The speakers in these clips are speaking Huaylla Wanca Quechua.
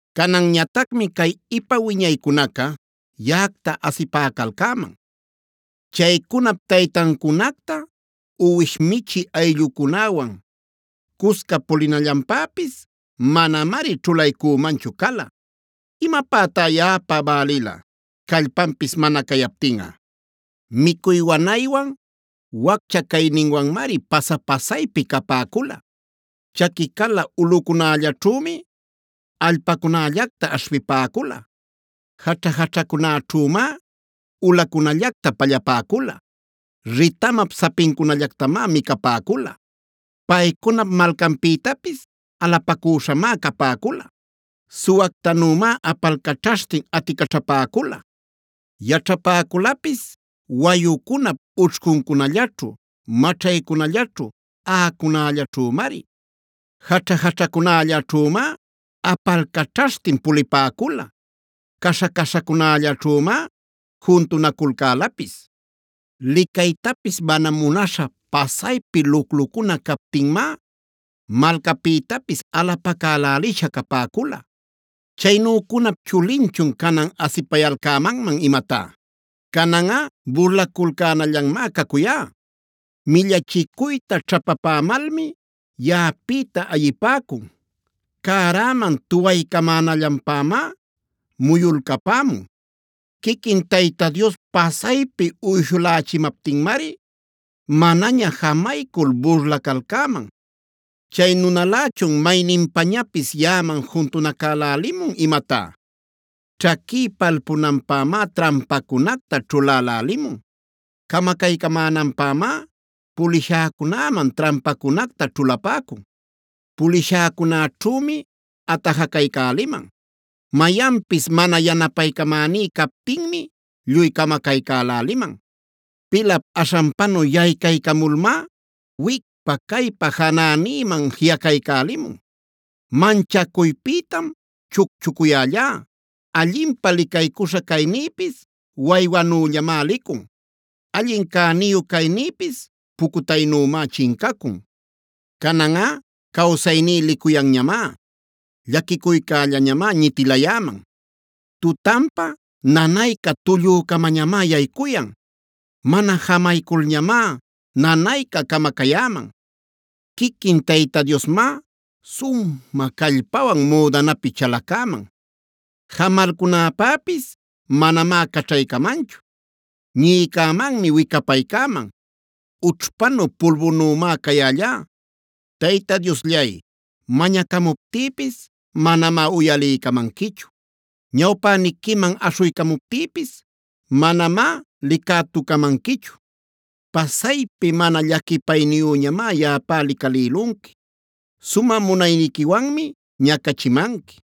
“Cananñatacmi cay ipa wiñaycunaca yaꞌacta asipäcalcäman. Chaycunap taytancunacta uwish michï allꞌücunawan cusca pulinallanpäpis manamari ćhulaycümanchu cala. ¿Imapätá yaꞌapä bälila callpanpis mana cayaptinꞌa? Micuy wanaywan, waccha cayninwanmari pasa-pasaypi capäcula; chaqui cala ulꞌucunällaćhümi allpacunällacta aśhpipäcula. Jaćha-jaćhacunäćhümá ulacunallacta pallapäcula; ritamap sapincunallactamá micapäcula. Paycuna malcanpïtapis alapacüśhamá capäcula; suwactanümá apalcaćhaśhtin aticaćhapäcula. Yaćhapäculapis wayucunap ućhcuncunallaćhu, maćhaycunallaćhu, aꞌacunällaćhümari. Jaćha-jaćhacunällaćhümá apalcaćhaśhtin pulipäcula; caśha-caśhacunällaćhümá juntunaculcälapis. Licaytapis mana munaśha pasaypi luclucuna captinmá malcapïtapis alapacälälisha capäcula. “¿Chaynücunap chulinchun canan asipayalcämanman imatá? Cananꞌa burlaculcänallanmá cacuyá. Millachicuyta ćhapapämalmi yaꞌapïta ayipäcun; cäräman tuwaycamänallanpämá muyulcapämun. Quiquin Tayta Dios pasaypi uyshulächimaptinmari, manaña jamaycul burlacalcäman. ¿Chay nunälächun mayninpañapis yaꞌaman juntanacälälimun imatá? Ćhaquí palpunanpämá trampacunacta ćhulälälimun, camacaycämänanpämá pulishäcunaman trampacunacta ćhulapäcun. Pulishäcunäćhümi atajacaycäliman; mayanpis mana yanapaycamäní captinmi lluy camacaycäläliman. Pilap aśhanpanu yaycaycamulmá, wicpa-caypa janänïman jiꞌacaycälimun. Manchacuypïtam chucchucuyällá, allinpä licaycuśha caynïpis waywanüllamá licun, allin cäniyu caynïpis pucutaynümá chincacun. “Cananꞌa cawsayní licuyanñamá; llaquicuycällañamá ñitilayäman. Tutanpa nanayca tullücamañamá yaycuyan; mana jamayculñamá nanayca camacayäman. Quiquin Tayta Diosmá sumä callpawan müdanäpi chalacäman; jamalcunäpäpis manamá caćhaycamanchu. Ñïcämanmi wicapaycäman; ućhpanu, pulbunümá cayällá. “Tayta Diosllay, mañacamuptïpis manamá uyaliycamanquichu; ñawpäniquiman aśhuycamuptïpis manamá licätucamanquichu. Pasaypi mana llaquipayniyüñamá yaꞌapä licalïlunqui; sumä munayniquiwanmi ñacachimanqui.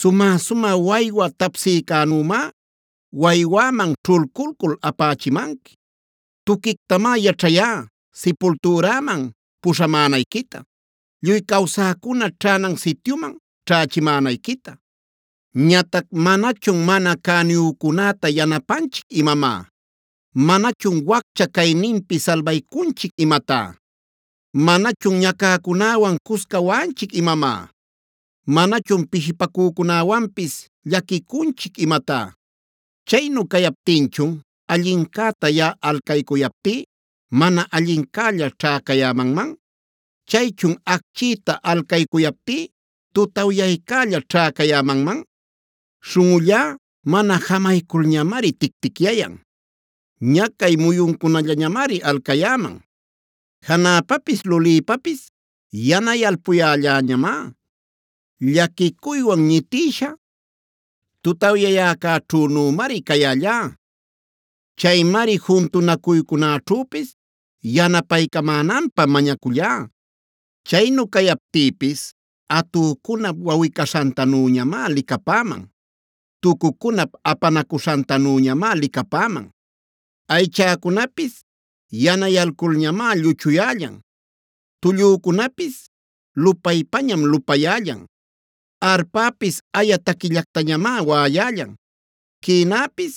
Sumä-sumä waywa tapsiycänümá, waywäman ćhulculcul apächimanqui. Tuquictamá yaćhayá silpultüräman puśhamänayquita, lluy cawsäcuna ćhänan sityuman ćhächimänayquita. “Ñatac ¿manachun mana cäniyücunäta yanapanchic imamá? ¿Manachun waccha cayninpi salbaycunchic imatá? ¿Manachun ñacäcunäwan cusca waꞌanchic imamá? ¿Manachun pishipacücunäwanpis llaquicunchic imatá? Chaynu cayaptinchun allincäta yaꞌa alcaycuyaptí, mana allincälla ćhäcayämanman. Chaychun acchïta alcaycuyaptí, tutawyaycälla ćhäcayämanman. Śhunꞌullá mana jamayculñamari ticticyayan; ñacay muyuncunallañamari alcayäman. Janäpapis lulïpapis yanayalpuyälläñamá; llaquicuywan ñitïsha, tutawyayäcäćhünümari cayällá. Chaymari juntunacuycunäćhüpis yanapaycamänanpä mañacullá. Chaynu cayaptïpis atücunap wawꞌi-caśhantanüñamá licapäman; tucucunap apanacuśhantanüñamá licapäman. Aychäcunapis yanayalculñamá lluchuyällan; tullücunapis lupaypañam lupayällan. Arpäpis aya taquillactañamá waꞌayällan; quïnäpis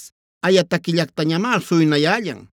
aya taquillactañamá suynayällan.